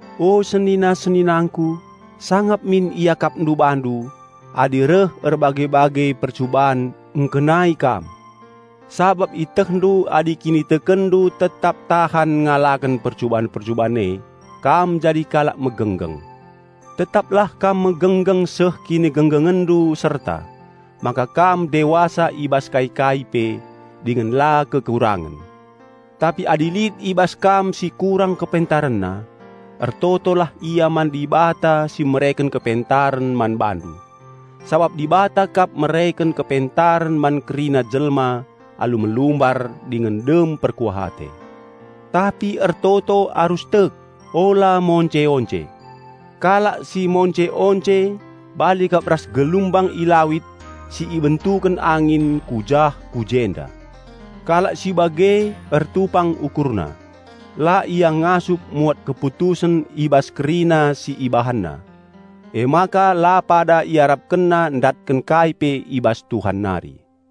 O senina-seninangku, sangap min iakapndu bandu adi reh erbage-bage percuban ngkenai kami. Sabap ietehndu adi kinitekenndu tetap tahan ngalaken percuban-percuban e, kam jadi kalak megenggeng. Tetaplah kam megenggeng seh kinigenggengenndu serta, maka kam dewasa i bas kai-kai pe, dingen la kekurangen. Tapi adi lit i bas kam si kurang kepentarenna, ertotolah ia man Dibata si mereken kepentaren man bandu. Sabap Dibata kap mereken kepentaren man kerina jelma alu melumbar dingen dem perkuah ate. Tapi ertoto arus tek, ula monce-once. Kalak si monce-once bali kap ras gelumbang i lawit si ibentuken angin ku jah ku jenda. Kalak si bage ertupang ukurna; la ia ngasup muat keputusen i bas kerina si ibahanna. Emaka la pada iarapkenna ndatken kai pe i bas Tuhan nari.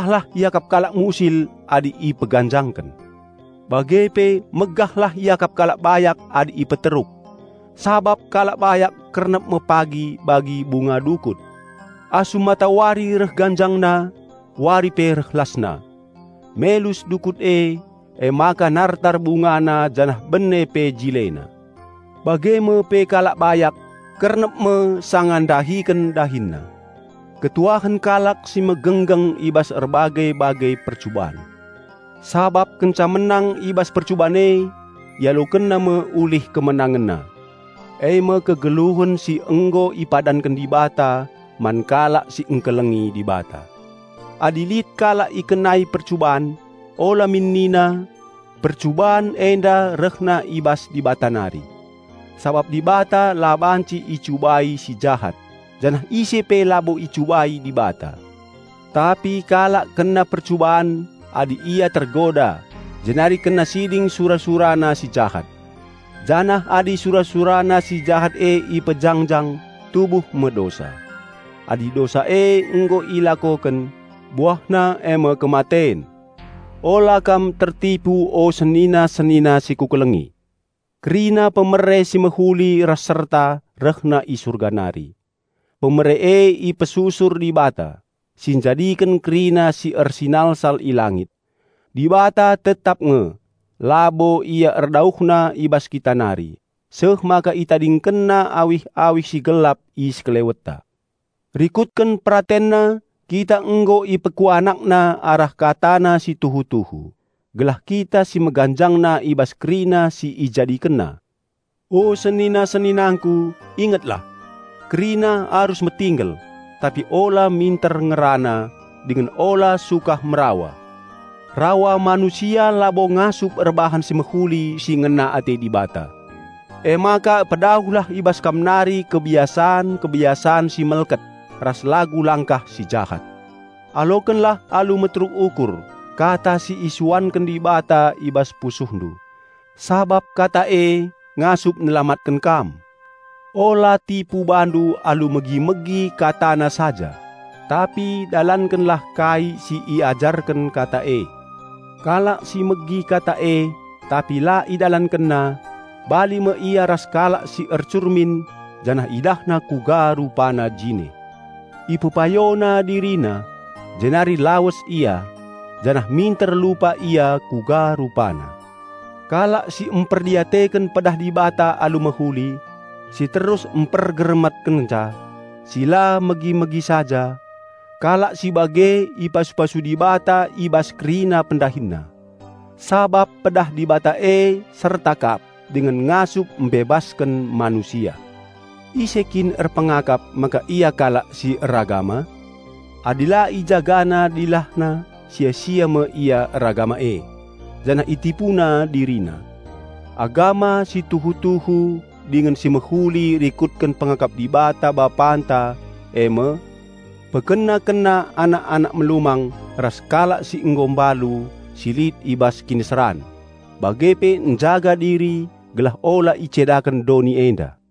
Megahlah iakap kalak musil adi ipeganjangken, bage pe megahlah iakap kalak bayak adi ipeteruk. Sabap kalak bayak kernep me pagi bagi bunga dukut. Asum matawari reh ganjangna, wari pe reh lasna, melus dukut e, emaka nartar bungana janah bene pe jilena. Bage me pe kalak bayak, kernep me sanga ndahiken dahinna. Malem me ate kalak si megenggeng sanga ikenai erbage-bage percuban. Sabap kenca menang i bas percuban e, ialokenna me ulih kemenangenna, e me kegeluhen si nggo ipadanken Dibata man kalak si ngkelengi Dibata. Adi lit kalak ikenai percuban, ula min nina, "Percuban enda rehna i bas Dibata nari." Sabap Dibata la banci icubai si jahat, janah ise pe labo icubai Dibata. Tapi kalak kena percuban adi ia tergoda jenari kena siding sura-surana si jahat. Janah adi sura-surana si jahat e ipejangjang, tubuh me dosa. Adi dosa e nggo ilakoken, buahna e me kematen. Ula kam tertipu o senina-senina si kukelengi! Kerina pemere si mehuli ras serta rehna i Surga nari; pemere e ipesusur Dibata, si njadiken kerina si ersinalsal i langit. Dibata tetap nge; labo Ia erdauhna i bas kita nari seh maka ItadingkenNa awih-awih si gelap i sekelewetta. Rikutken PeratenNa kita nggo IpekuanakNa arah KataNa si tuhu-tuhu, gelah kita si meganjangna i bas kerina si IjadikenNa. O senina-seninangku, ingetlah! Kerina arus metinggel, tapi ula minter ngerana, dingen ula sukah merawa. Rawa manusia labo ngasup erbahan si mehuli si ngena ate Dibata. Emaka pedauhlah i bas kam nari kebiasan-kebiasan si melket ras lagu langkah si jahat. Alokenlah alu meteruk ukur kata si isuanken Dibata i bas pusuhndu, sabap kata e ngasup nelamatken kam. Ula tipu bandu alu megi-megi KataNa saja, tapi dalankenlah kai si iajarken Kata e. Kalak si megi Kata e tapi la idalankenna, bali me ia ras kalak si ercurmin, janah idahna uga rupana jine. Ipepayona dirina, jenari lawes ia, janah minter lupa ia kuga rupana. Kalak si mperdiateken pedah Dibata alu mehuli, si terus mpergermetkenca, si la megi-megi saja, kalak si bage ipasu-pasu Dibata i bas kerina pendahinna. Sabap pedah Dibata e serta kap dingen ngasup mbebasken manusia. Ise kin erpengakap maka ia kalak si eragama? Adi la ijagana dilahna sia-sia me ia eragama e, janah itipuna dirina. Agama si tuhu-tuhu dingen si mehuli rikutken pengakap Dibata Bapanta e me: pekena-kena anak-anak melumang ras kalak si nggo mbalu si lit i bas kiniseran, bage pe njaga diri gelah ula icedaken doni enda.